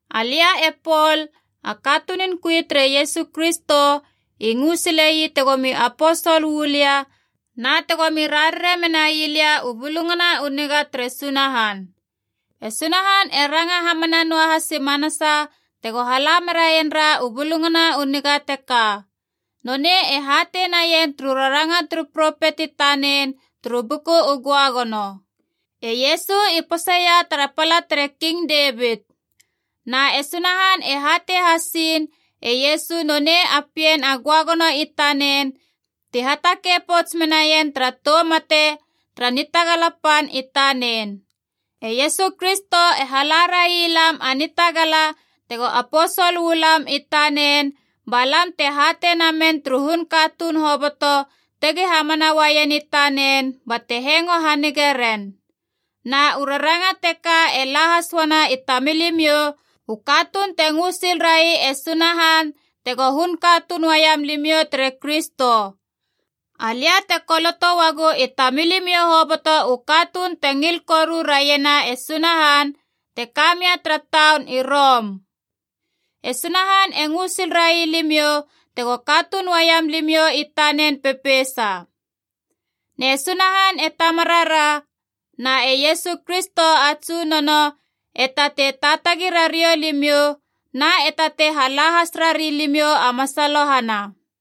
Alia e Pol, a katunun kui tere Iesu Kristo, i ngö sile ii tegomi aposol uu lia na tegomi rarare menai lia U Bulungana u Niga tere Sunahan. E Sunahan e ranga hamana noa has i manasa tego hala meraien ra u Bulungana u Niga teka. Nonei e hatei naien turu raranga turu propet i tanen turu Buku u Göagono. E Iesu i poseia tara pala tere King Devit. Na e Sunahan e hatei hasiin e Iesu nonei a Pien a Göagono i tanen ti hatakei pouts menaien tara tou mate tara nitagala pan i tanen. E Iesu Kristo e hala railam a nitagala tego aposol uu lam i tanen, ba lam te hatei namen turu hun katuun hoboto tegi hamana uaien i tanen, bate hengo hanige ren. Na u raranga teka e la has uana i tamilimiou, u katuun te ngö sil rai e Sunahan tego hun katuun uaiam limiou tere Kristo. Alia te koloto uagu i tamilimiou hoboto u katuun te ngil koru raiena e Sunahan te ka mia tara taun i Rom. E Sunahan e ngö sil railimiou tego katuun uaiam limiou i tanen pepeisa. Ne Sunahan e Tamarara na e Iesu Kristo a Tsunono, e tatei taatagi rariou limiou na e tatei hala has rari limiou a masalohana.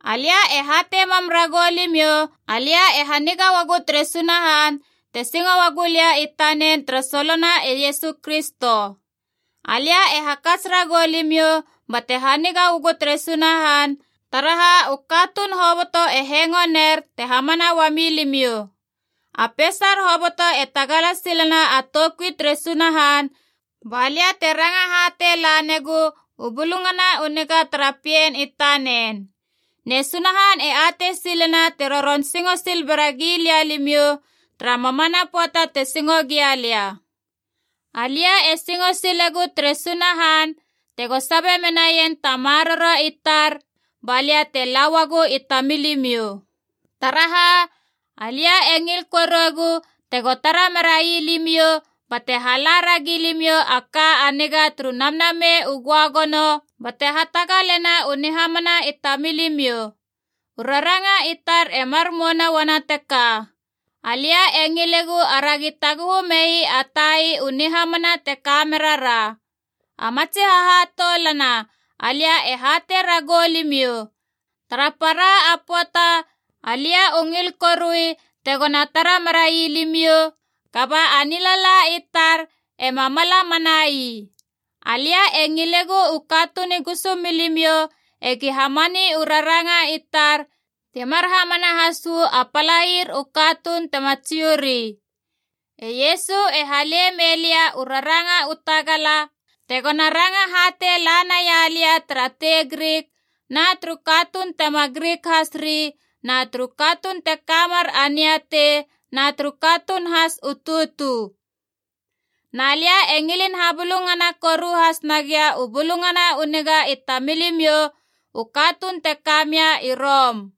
Alia e hatei mam ragou limiou alia e haniga uagu tere Sunahan, te singo uagu lia i tanen tara solona e Iesu Kristo. Alia e hakats ragou limiou bate haniga uagu tere Sunahan, taraha u katuun hoboto e hengo ner te hamana uami limiou. A peisar hoboto e tagala silena a toukui tere Sunahan, balia te ranga hatei lanegu u Bulungana u Niga tara Pien i tanen. Ne Sunahan e atei silena te roron singo sil bera gilia limiou, tara mamana pöata te singo gia lia. Alia e singo silegu tere Sunahan tego sabe menaien ta maroro i tar, balia te la uagou i tamilimiou. Taraha, alia e ngil koruegu tego tara merai limiou bate hala ragi limiou a ka a niga turu Namnamei u Göagono, bate hatagalena u nihamana i tamilimiou. U raranga i tar e mar mouna uana teka: alia e ngilegu aragi taguhu mei a tai u nihamana te kamerara. A matsi hahatoulana alia e hatei ragou limiou, tara para a pöata alia u ngil korui tegona tara merai limiou, kaba a nilala i tar ema mala manai. Alia e ngilegu u katuun i gusumilimiou egi hamani u raranga i tar, ti mar hamana has uu a palair u katuun tema Jiu ri. E Iesu e hale mei lia u raranga u tagala tegona ranga hatei lanaia lia tara tei Grik na turu katuun tema Grik has ri na turu katuun te kamer a niatei na turu katuun has u tutu. Na lia e ngilin habulungana koru has nagia u Bulungana u Niga i tamilimiou u katuun te ka mia i Rom.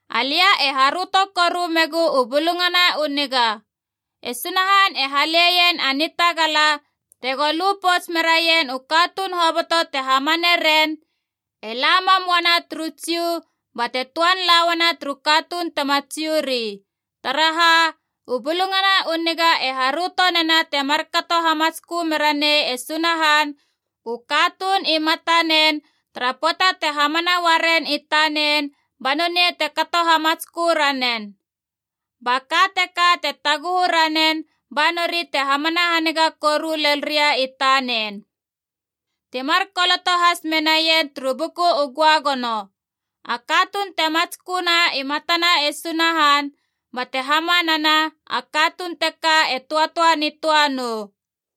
Alia e haröto koru megu u Bulungana u Niga. E Sunahan e haleien a nitagala tego lu pouts merien u katuun hoboto te hamane ren, e la mam uana turu Jiu, bate töan la uana turu katuun tema Jiu ri. Taraha, u Bulungana u Niga e haröto nena te markato hamatskö mera nei e Sunahan u katuun i matanen tara pöata te hamana uaren i tanen, ba nonei te kato hamatskö ranen. Ba ka teka te taguhu ranen ba nori te hamana haniga koru lel ria i tanen. Ti mar koloto has menaien turu Buku u Göagono, “A katuun te matsköna i matana e Sunahan bate hamanana, a katuun teka te töatöa nitöa nou.”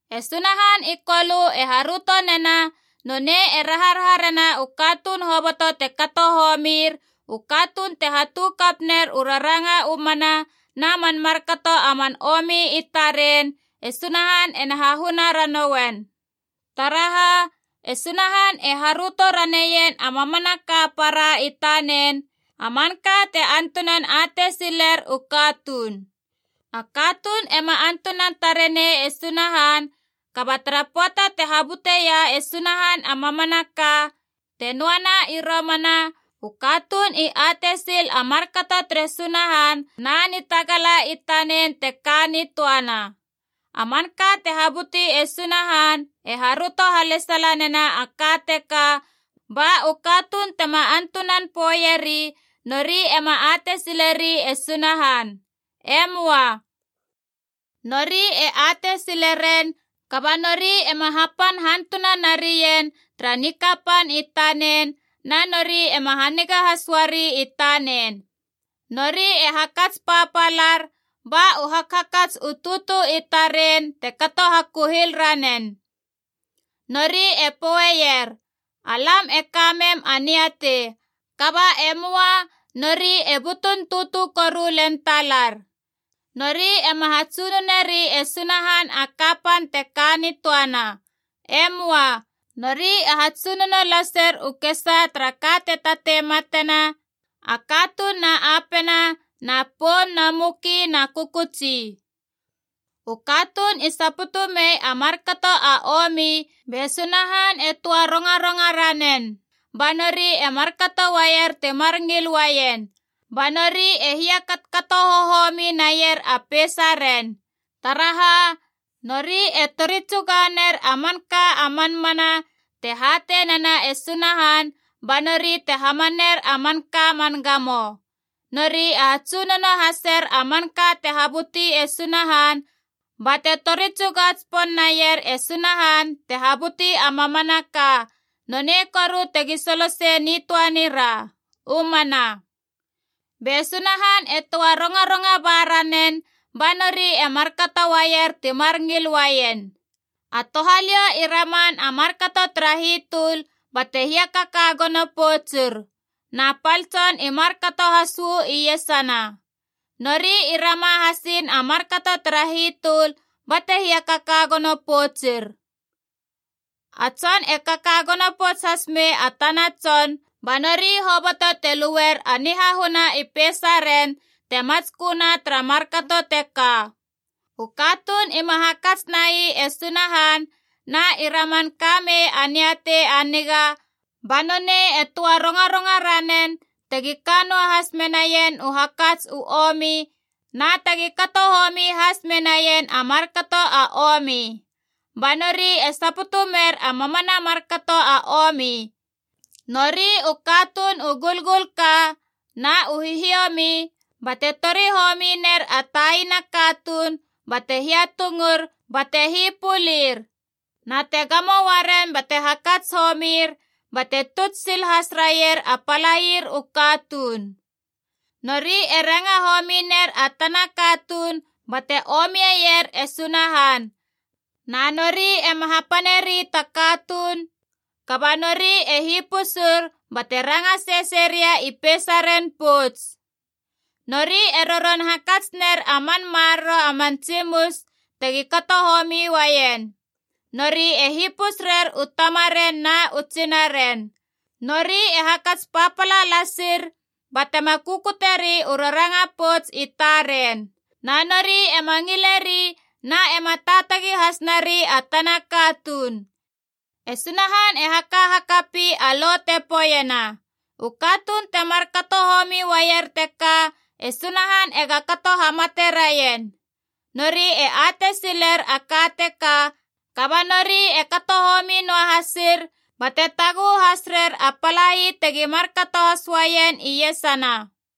E Sunahan i Kolö e haröto nena nonei e raharaha rena u katuun hoboto te kato homir, u katuun te hatu kap ner u raranga u mana na man markato a man omi i taren, e Sunahan ena hahuna ranouen. Taraha, e Sunahan e haröto raneien a mamanaka a para i tanen, a manka te antunan atei siler u katuun. A katuun ema antunan tare nei e Sunahan, kaba tara pöata te habuteia e Sunahan a mamanaka te noana i romana, u katuun i atei sil a markato tere Sunahan na nitagala i tanen te ka nitöana. A manka te habuti e Sunahan e haröto halesala nena a ka teka, ba u katuun tema antunan poeieri nori ema atei sileri e Sunahan. E möa. Nori e atei sileren, kaba nori ema hapan hantuna narien tara nikapan i tanen, na nori ema haniga has uari i tanen. Nori e hakats papalar, ba u hakhakats u tutu i taren te kato hakuhil ranen. Nori e poeier, “Alam e ka mem a niatei,” kaba e möa, nori e butun tutu koru len talar. Nori ema hatsunoneri e Sunahan a kapan te ka nitöana. E möa. Nori e hatsunono laser u kesaa tara ka te tatei matena: a katuun na apena na poum na muki na kökötsi. U katuun i saputu mei a markato a omi be Sunahan e töa rongaronga ranen ba nori e markato uaier timar ngil uaien, ba nori e hiakatokato hohomi naier a peisaren. Taraha, nori e tori tsuga ner a manka a man mana te hatei nena e Sunahan ba nori te hamaner a manka a man gamo. Nori e hatsunono haser a manka te habuti e Sunahan, bate tori tsuga tsipon naier e Sunahan te habuti a mamanaka, nonei koru tegi solo sei nitöa nira! U mana. Be Sunahan e töa rongaronga ba ranen ba nori e markato uaier timar ngil uaien. A touhaliou i raman a markato tara hitöl bate hiakaka gono poutsur. Na pal tson i markato has uu iesana. Nori i rama hasiin a markato tara hitöl bate hiakaka gono poutsir. A tson e kaka gono pouts has mei a tana tson, ba nori hoboto te luer a nihahuna i peisaren te matsköna tara markato teka. U katuun ima hakats nai e Sunahan na i raman ka mei a niatei a niga, ba nonei e töa rongaronga ranen tegi ka noahas menaien u hakats u omi na tegi kato homi has menaien a markato a omi. Ba nori e saputu mer a mamana a markato a omi: nori u katuun u gulgulka, na u hihiomi bate tori homi ner a taina katuun bate hiatungur bate hipölir. Na te gamo uaren bate hakats homir bate tuts sil has raier a palair u katuun. Nori e ranga homi ner a tana katuun bate omier e Sunahan. Na nori ema hapaneri ta katuun, kaba nori e hipusur bate ranga sesei ria i peisaren pouts. Nori e roron hakats ner a man maroro a man tsimus tegi kato homi uaien. Nori e hipus rer u tamaren na u tsinaren. Nori e hakats papala lasir, batema kukuteri u raranga pouts i taren. Na nori ema ngileri na ema taatagi has nari a tana katuun. E Sunahan e haka hakapi a lo te poeiena, u katuun te markato homi uaier teka e Sunahan ega kato hamate raien. Nori e atei siler a ka teka, kaba nori e kato homi noa hasir, bate taguhu has rer a palai tegi markato has uaien iesana.